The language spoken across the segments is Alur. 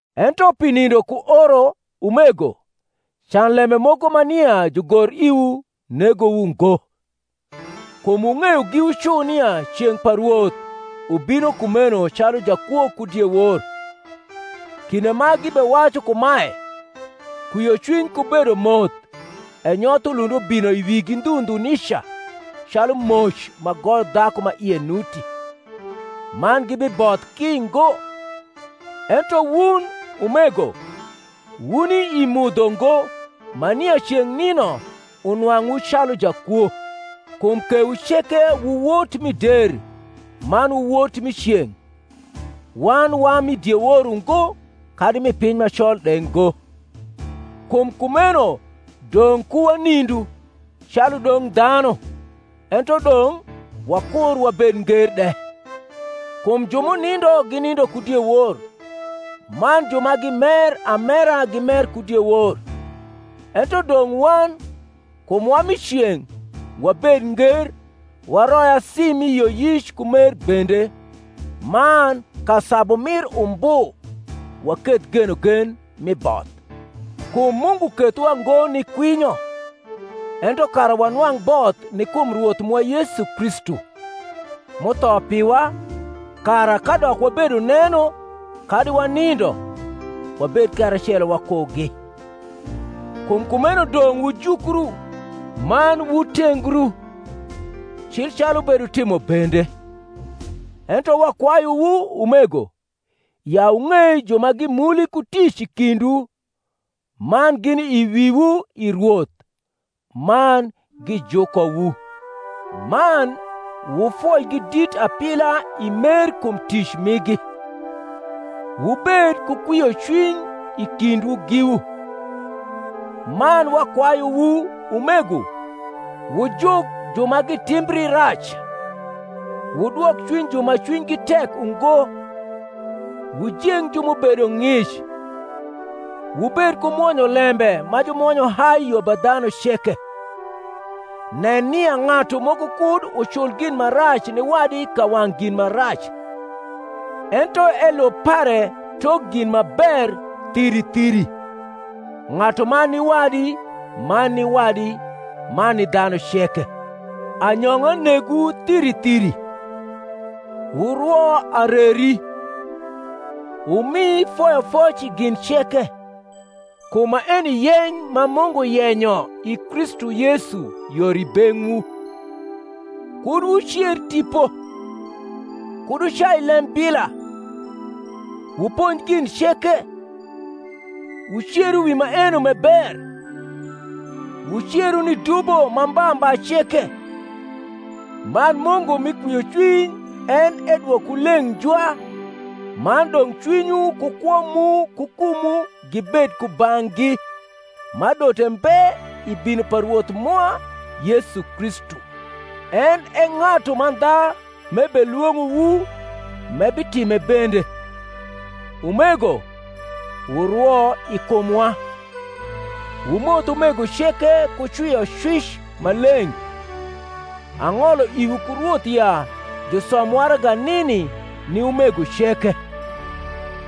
Ento pi nindo ku oro, umego, can lembe moko ma nia jugor iwu negowu ngo. Kum wung’eyo giwu cu nia ceng’ pa Rwoth ubino kumeno calu jakwo ku diewor. Kinde ma gibewacu kumae, Kwiocwiny ku bedomoth e nyoth ulund ubino i wigi ndhu ndhu nica, calu moc ma goyo dhaku ma ie nuti; man gibiboth ki ngo. Ento wun, umego, wuni i mudho ngo, ma nia ceng’ nino unwang’wu calu jakwo: kum kewu ceke wu wot mi der, man wu wot mi ceng’: wan wa mi diewor ungo, kadi mi piny ma col de ngo; kum kumeno dong’ ku wanindu, calu dong dhanu, ento dong’ wakur wabed nger de. Kum ju m’unindo ginindo ku diewor; man ju ma gimer amera gimer ku diewor. Ento dong’ wan, kum wa mi ceng’, wabed nger, waroi asi mi yioyic ku mer bende; man ka sabu mir umbu, waketh genogen mi both. Kum Mungu kethowa ngo ni kwinyo, ento kara wanwang’ both ni kum Rwoth mwa Yesu Kristu, m’utho piwa, kara, kadok wabedo neno kadi wanindo, wabed karacelo wakugi. Kum kumeno dong’ wujukru, man wutengru, cil calu wubetimo bende. Ento wakwayuwu, umego, ya wung’ei ju ma gimuli ku tic i kindwu, man gini i wiwu i Rwoth, man gijukowu; man wufoigi dit apila i mer kum tic migi. Wubed ku kwiocwiny i kindwu giwu. Man wakwayuwu, umego, wujuk ju ma gitimbri rac, wudwok cwiny ju ma cwinygi tek ungo, wujeng ju m’ubedo ng’ic, wubed ku mwonyolembe ma jumwonyo hai yo ba dhanu ceke. Nen nia ng’atu moko kud ucul gin ma rac ni wadi ka wang’ gin ma rac; ento elub pare tok gin ma ber thiri thiri, ng’atuman ni wadi man ni wadi, man ni dhanu ceke. Anyong’a negwu thiri thiri; wurwo areri; wumi foyofoc i gin ceke: kum maeni yeny ma Mungu yenyo i Kristu Yesu yor i beng’wu. Kud wucer Tipo; kud wucai lembila; wuponj gin ceke; wuceru wi maeno m’e ber; wuceru ni dubo ma mba mba ceke. Man Mungu mi kwiocwiny en edwokwu leng’ njwa; man dong’ cwinywu ku kwo mu ku kumwu gibed kubang’gi: ma adote mbe i bino pa Rwoth mwa Yesu Kristu. En e ng’atu mandha m’ebelwong’owu, m’ebitime bende. Umego, wurwo i kumwa. Wumoth umego ceke ku cwiocwic ma leng’. Ang’olo iwu ku Rwoth ya jusom waraga nini ni umego ceke.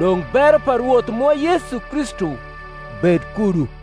Dong’ bero pa Rwoth mwa Yesu Kristu bed kudu.